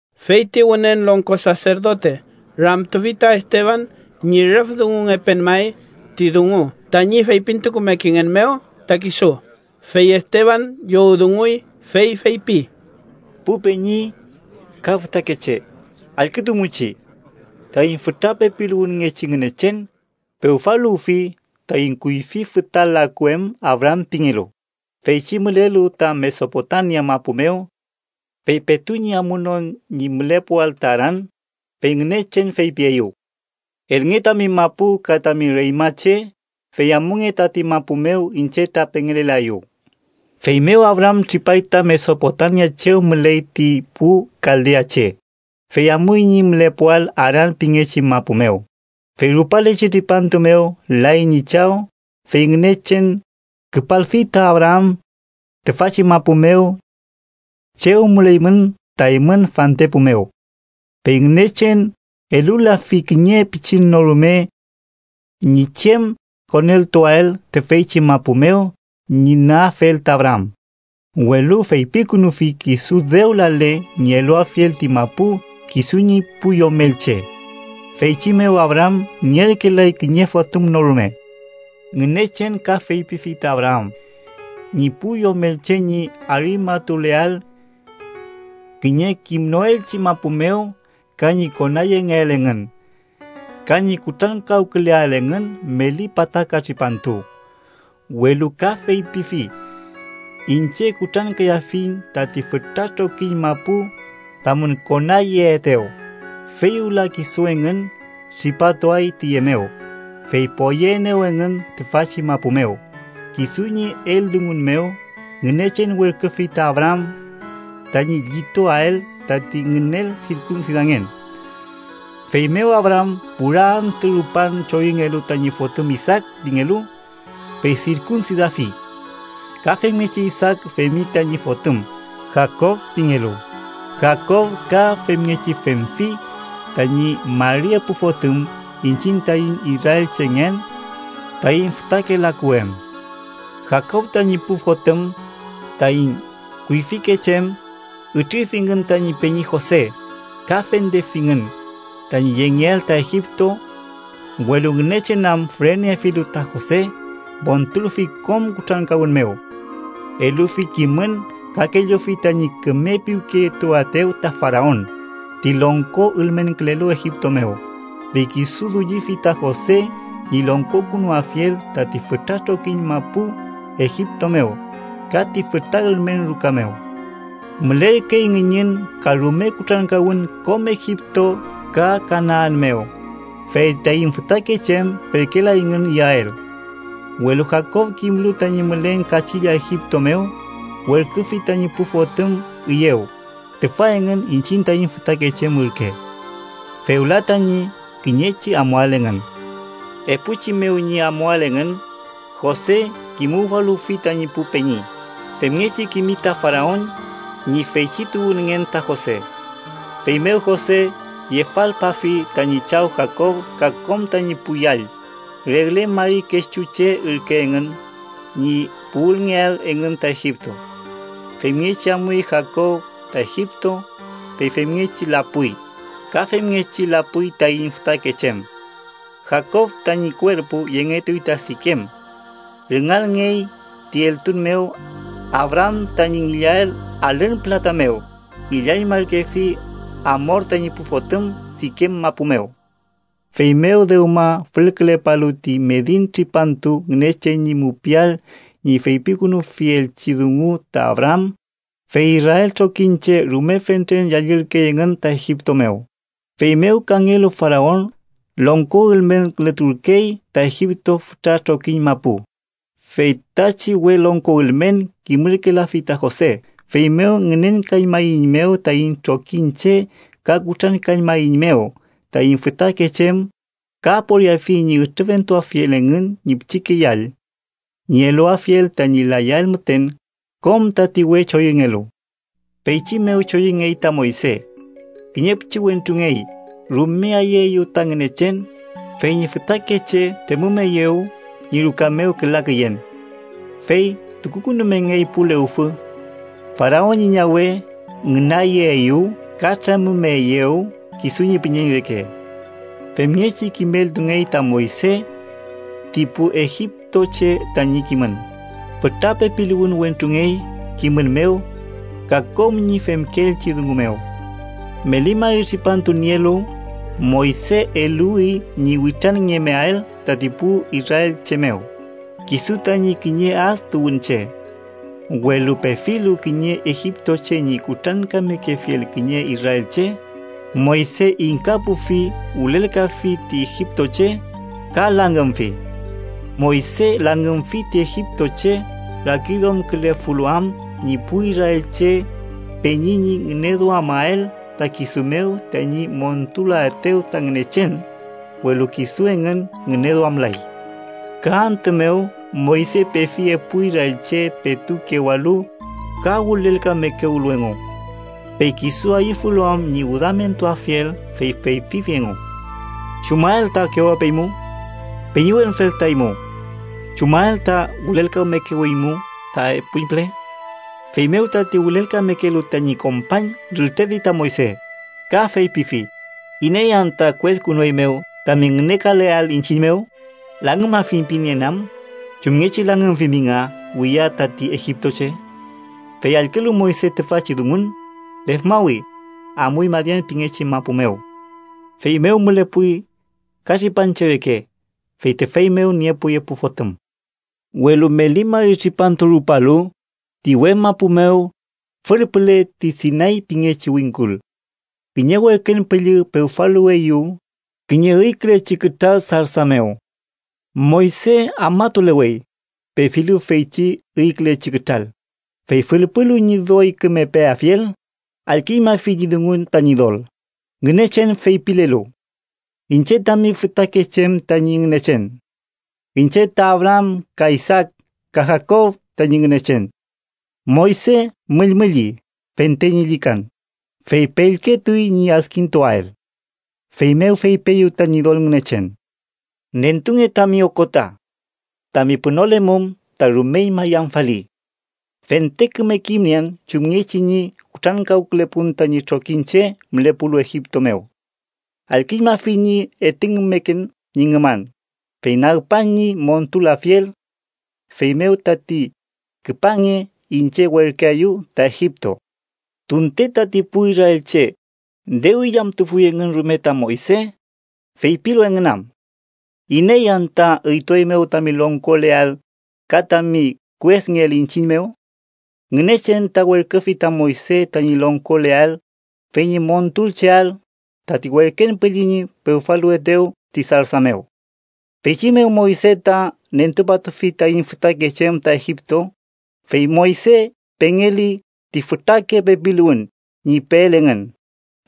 Fey ti Wünen Longko Saserdote ramtufi ta Esteban ñi rüf dungungepen may ti dungu tañi feypintumekengen mew ta kisu. Fey Esteban llowdunguy, fey feypi: “Pu peñi ka fütakeche, allkütumuchi. Taiñ fütra pepiluwünngechi Ngünechen pewfaluwfi taiñ kuyfi füta laku em Abraam pingelu, feychi mülelu ta Mesopotamia mapu mew. Fey petu ñi amunon ñi mülepuwael ta Aran, fey Ngünechen feypieyew: ‘Elnge tami mapu ka tami reñmache, fey amunge tati mapu mew iñche ta pengelelaeyu.’ “Feymew Abraam tripay ta Mesopotamia chew müley ti pu kaldeache, fey amuy ñi mülepuael Aran pingechi mapu mew. Fey rupalechi tripantu mew lay ñi chaw, fey Ngünechen küpalfi ta Abraam tüfachi mapu mew chew müleymün ta eymün fantepu mew. Fey Ngünechen elulafi kiñe pichin no rume ñi chem koneltuael tüfeychi mapu mew ñi nüafel ta Abraam. Welu feypikünufi kisu dew lale ñi eluafiel ti mapu kisu ñi pu yomelche. Feychi mew Abraam nierkelay kiñe fotüm no rume. Ngünechen ka feypifi ta Abraam ñi pu yomelche ñi arimatuleael kiñe kimnoelchi mapu mew ka ñi konayengeael engün ka ñi kutrankawküleael engün meli pataka tripantu. Welu ka feypifi: ‘Iñche kutrankayafiñ tati fütra trokiñ mapu tamün konayeetew, fey wüla kisu engün tripatuay tüye mew, fey poyeaenew engün tüfachi mapu mew.’ Kisu ñi eldungu mew, Ngünechen werküfi ta Abraam tañi llituael tati ngünel sirkunsidangen. Feymew, Abraam, pura antü rupan choyüngelu tañi fotüm Isaak pingelu, fey sirkunsidafi. Ka femngechi Isaak femfi tañi fotüm Jakob pingelu, Jakob ka femngechi femfi tañi mari epu fotüm, iñchiñ taiñ israelchengen taiñ fütake laku em. “Jakob tañi pu fotüm, taiñ kuyfikeche em, ütrirfingün tañi peñi Jose, ka fendefingün tañi yengeael ta Egipto. Welu Ngünechen am füreneniefilu ta Jose, montulfi kom kutrankawün mew. Elufi kimün ka kellufi tañi küme piwketuaetew ta Faraon, ti longko ülmenkülelu Egipto mew, fey kisu dullifi ta Jose ñi longkokünuafiel tati fütra trokiñ mapu Egipto mew, ka ti fütra ülmen ruka mew. Mülerkey ngüñün ka rume kutrankawün kom Egipto ka Kanaan mew, fey taiñ fütakeche em perkelayngün iyael. Welu Jakob kimlu tañi mülen kachilla Egipto mew, werküfi tañi pu fotüm üyew, tüfa engün iñchiñ taiñ fütakeche em ürke. Fewla tañi kiñechi amuael engün. Epuchi mew ñi amuael engün, Jose kimuwfaluwfi tañi pu peñi, femngechi kimi ta Faraon ñi feychi tuwünngen ta Jose. Feymew Jose yefalpafi tañi chaw Jakob ka kom tañi pu yall, regle mari kechu che ürke engün, ñi puwülngeael engün ta Egipto. Femngechi amuy Jakob ta Egipto, fey femngechi lapuy, ka femngechi lapuy taiñ fütakeche em. Jakob tañi kuerpu yengetuy ta Sikem. Rüngalngey ti eltun mew Abraam tañi ngillael alün pülata mew. Ngillañmarkefi Amor tañi pu fotüm, Sikem mapu mew. “Feymew dewma fülkülepalu ti medin tripantu Ngünechen ñi mupiael ñi feypikünufielchi dungu ta Abraam, fey Israel trokiñche rume fentren yallürkey engün ta Egipto mew. Feymew kangelu Faraon longko ülmenkületurkey ta Egipto fütra trokiñ mapu, fey tachi we longko ülmen kimürkelafi ta Jose. Feymew ngünenkañmaeiñmew taiñ trokiñche ka kutrankañmaeiñmew taiñ fütakeche em. Ka aporiafi ñi ütrüfentuafiel engün ñi pichike yall ñi eluafiel tañi layael müten kom tati we choyüngelu. Feychi mew choyüngey ta Moyse. Kiñe pichiwentrungey rume ayüeyew ta Ngünechen, fey ñi fütakeche tremümeyew ñi ruka mew küla küyen. Fey tukukünumengey pu lewfü. Faraon ñi ñawe ngünayeeyew ka tremümeyew kisu ñi püñeñ reke. Femngechi kimeltungey ta Moyse ti pu egiptoche tañi kimün. Fütra pepiluwün wentrungey kimün mew ka kom ñi femkeelchi dungu mew. “Meli mari tripantu nielu, Moyse eluwi ñi witranngemeael tati pu israelche mew, kisu tañi kiñe ad tuwünche. Welu pefilu kiñe egiptoche ñi kutrankamekefiel kiñe israelche, Moyse ingkapufi, wülelkafi ti egiptoche ka langümfi. Moyse langümfi ti egiptoche rakiduamkülefulu am ñi pu israelche peñi ñi ngüneduamael ta kisu mew tañi montulaetew ta Ngünechen, welu kisu engün ngüneduamlay. “Ka antü mew, Moyse pefi epu israelche petu kewalu ka wülelkamekewlu engu. Fey kisu ayüfulu am ñi wüdamentuafiel, fey feypifi engu: ‘¿Chumael ta kewapeymu, peñiwenfel ta eymu? ¿Chumael ta wülelkamekewimu ta epuñpüle?’ Feymew tati wülelkamekelu tañi kompañ rültrefi ta Moyse, ka feypifi: ‘¿Iney anta kueskünueymew tami ngünekaleael iñchiñ mew? ¿Langümafiñ pinieen am chumngechi langümfimi nga wiya tati egiptoche?’ Fey allkülu Moyse tüfachi dungun, lefmawi, amuy Madian pingechi mapu mew. Feymew mülepuy katripanche reke, fey tüfey mew niepuy epu fotüm. “Welu meli mari tripantu rupalu, ti uwe mapu mew, fülpüle ti Sinay pingechi wingkul, kiñe werken püllü pewfaluweyew kiñe üykülechi kütral sarsa mew. Moyse afmatulewey, pefilu feychi üykülechi kütral, fey fülpulu ñi doy küme peafiel, allküñmafi ñi dungun ta Ñidol Ngünechen, feypilelu: ‘Iñche tami fütakeche em tañi Ngünechen. Iñche ta Abraam ka Isaak, ka Jakob tañi Ngünechen.’ Moyse müllmülli fente ñi llükan, fey pellketuy ñi adkintuael. Feymew fepieyew ta Ñidol Ngünechen: ‘Nentunge tami okota. Tami pünolemum ta rumeñma yamfali. Fente küme kimnien chumngechi ñi kutrankawkülepun tañi trokiñche mülepulu Egipto mew. Allküñmafiñ ñi etüngkümeken ñi ngüman, fey nagpan ñi montulafiel. Feymew tati, küpange, iñche werküaeyu ta Egipto.’ “Tunte tati pu israelche dew illamtufuy engün rume ta Moyse, feypilu engün am: ‘¿Iney anta üytueymew tami longkoleael ka tami kuesngeael iñchiñ mew?’ Ngünechen ta werküfi ta Moyse tañi longkoleael, fey ñi montulcheael tati werken püllü ñi pewfaluwetew ti sarsa mew. Feychi mew Moyse ta nentupatufi taiñ fütakeche em ta Egipto, fey Moyse pengeli ti fütrake pepiluwün ñi peel engün,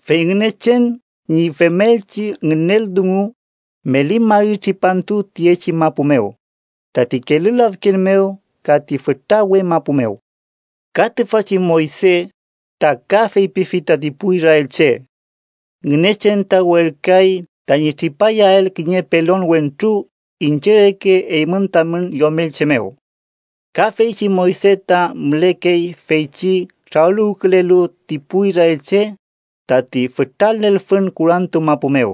fey Ngünechen ñi femelchi ngünel dungu meli mari tripantu tiyechi mapu mew, tati Kelü Lafken mew ka ti fütra uwe mapu mew. Ka tüfachi Moyse ta ka feypifi tati pu israelche: ‘Ngünechen ta werküay tañi tripayael kiñe pelon wentru iñche reke eymün tamün yomelche mew.’ Ka feychi Moyse ta mülekey feychi trawüluwkülelu ti pu israelche tati fütra lelfün kurantu mapu mew,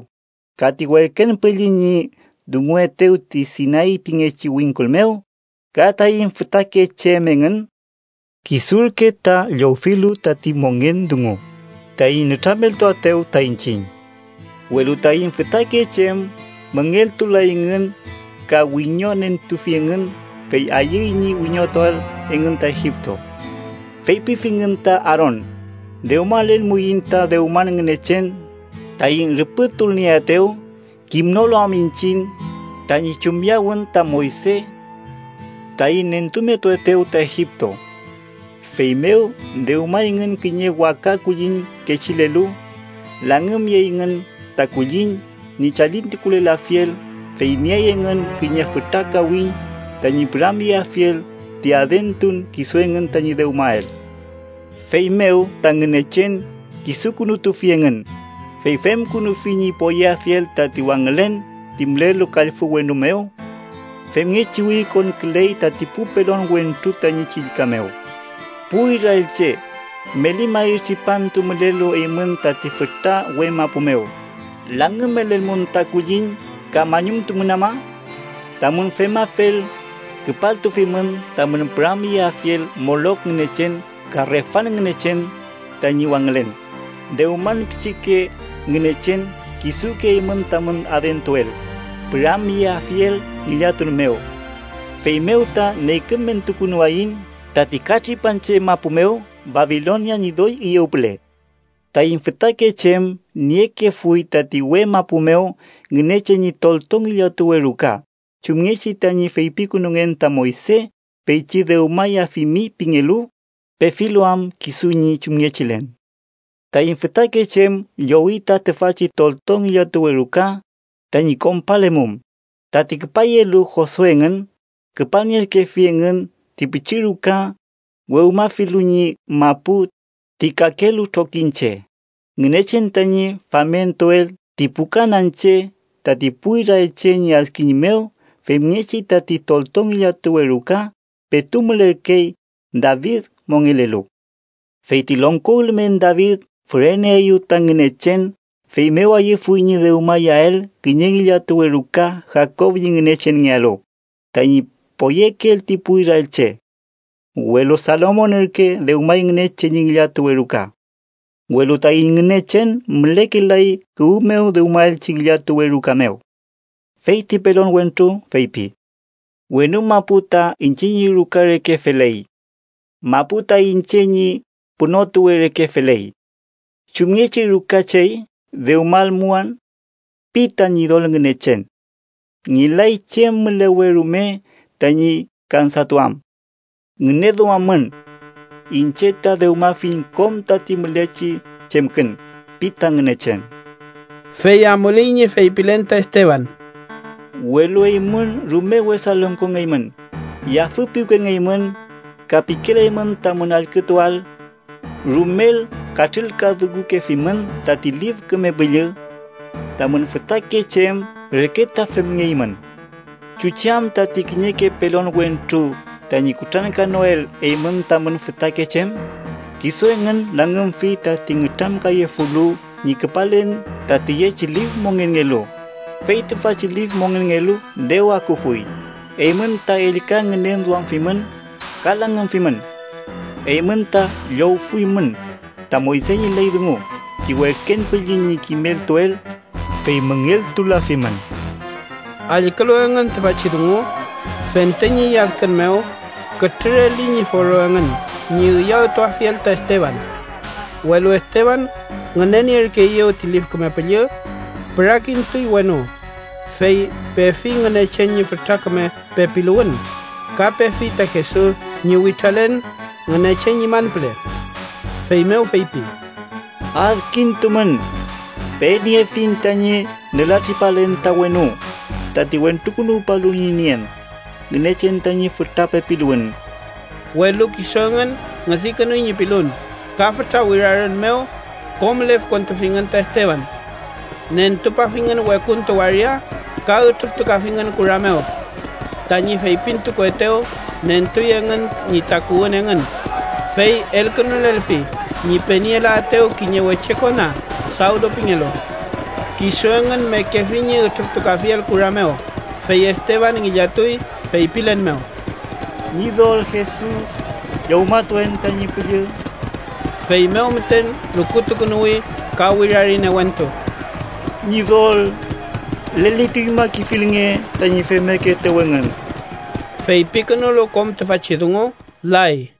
ka ti werken püllü ñi dunguetew ti Sinay pingechi wingkul mew, ka taiñ fütakeche em engün. Kisurke ta llowfilu tati mongen dungu taiñ nütrameltuaetew ta iñchiñ. “Welu taiñ fütakeche em müngeltulayngün, ka wiñonentufingün fey ayüy ñi wiñotuael engün ta Egipto. Feypifingün ta Aaron ‘dewmalelmuiñ ta dewman ngünechen taiñ rüpütulnieaetew, kimnolu am iñchiñ tañi chumyawün ta Moyse taiñ nentumetuetew ta Egipto.’ Feymew dewmayngün kiñe waka kulliñ kechilelu, langümyeyngün ta kulliñ ñi chalintukulelafiel, fey niey engün kiñe fütra kawiñ tañi püramyeafiel ti adentun kisu engün tañi dewmael. Feymew ta Ngünechen kisukünutufi engün, fey femkünufi ñi poyeafiel tati wangülen ti mülelu kallfü wenu mew. Femngechi wirikonküley tati pu pelon wentru tañi chillka mew: ‘Pu israelche, meli mari tripantu mülelu eymün tati fütra uwe mapu mew, ¿langümelelmun ta kulliñ ka mañumtumun ama? Tamün femafel, küpaltufimün tamün püramyeafiel Molok ngünechen ka Refan ngünechen tañi wangülen, dewman pichike ngünechen kisuke eymün tamün adentuel, püramyeafiel ngillatun mew. Feymew ta neykümentukünuwayiñ tati katripanche mapu mew Babilonia ñi doy üyew püle.’ “Taiñ fütakeche em niekefuy tati uwe mapu mew Ngünechen ñi tolto ngillatuwe ruka chumngechi tañi feypikünungen ta Moyse feychi dewmayafimi pingelu, pefilu am kisu ñi chumngechilen. Taiñ fütakeche em llowi ta tüfachi tolto ngillatuwe ruka tañi konpalemum, tati küpayelu Josue engün küpalnierkefi engün ti pichi ruka wewmafilu ñi mapu ti kakelu trokiñche, Ngünechen tañi famentuel ti pu kananche tati pu israelche ñi adkiñ mew femngechi tati tolto ngillatuwe ruka petu mülerkey David mongelelu. Fey ti longko ülmen David füreneeyew ta Ngünechen, feymew ayüfuy ñi dewmayael kiñe ngillatuwe ruka Jakob ñi Ngünechenngealu, tañi poyekeel ti pu israelche. Welu Salomon ürke dewmay Ngünechen ñi ngillatuwe ruka. Welu taiñ Ngünechen mülekelay kuwü mew dewmaelchi ngillatuwe ruka mew. Fey ti pelon wentru feypi: ‘Wenu mapu ta iñche ñi ruka reke feley. Mapu ta iñche ñi pünotuwe reke feley. ¿Chumngechi ruka chey dewmalmuan? pi ta Ñidol Ngünechen: Ngelay chem mülewe rume tañi kansatuam. Ngüneduammün. Iñche ta dewmafiñ kom tati mülechi chemkün’ pi ta Ngünechen.” Fey amuley ñi feypilen ta Esteban: “Welu eymün rume wesa longkongeymün, yafüpiwkengeymün ka pikelaymün tamün allkütuael. Rumel katrülkadungukefimün tati Lif Küme Püllü. Tamün fütakeche em reke ta femngeymün. ¿Chuchi am tati kiñeke pelon wentru tañi kutrankanoel eymün tamün fütakeche em? Kisu engün langümfi tati nütramkayefulu ñi küpalen ta tiyechi lif mongenngelu, fey tüfachi lif mongenngelu dew akufuy, eymün ta ellka ngünenmafimün ka langümfimün. Eymün, ta llowfuymün ta Moyse ñi ley dungu ti werken püllü ñi kimeltuel, fey müngeltulafimün.” Allkülu engün tüfachi dungu, fente ñi lladkün mew kütrüreli ñi foro engün ñi üyawtuafiel ta Esteban. Welu Esteban ngünenierkeeyew ti Lif Küme Püllü, pürakintuy wenu, fey pefi Ngünechen ñi fütra küme pepiluwün ka pefi ta Jesus ñi witralen Ngünechen ñi manpüle. Feymew feypi: “¡Adkintumün! Peniefiñ tañi nülatripalen ta wenu, tati Wentrukünuwpalu ñi nien Ngünechen tañi fütra pepiluwün.” Welu kisu engün ngüdikünuy ñi pilun, ka fütra wirarün mew kom lefkontufingün ta Esteban. Nentupafingün wekuntu waria ka ütrüftukafingün kura mew. Tañi feypintukuetew nentuy engün ñi takuwün engün, fey elkünulelfi ñi penielaetew kiñe weche kona Sawlu pingelu. Kisu engün mekefi ñi ütrüftukafiel kura mew. Fey Esteban ngillatuy, feypilen mew: “Ñidol Jesus, llowmatuen tañi püllü.” Feymew müten lukutukünuwi ka wirari newentu: “¡Ñidol lelituñmakefilnge tañi femmekeetew engün!” Feypikünulu kom tüfachi dungu, lay.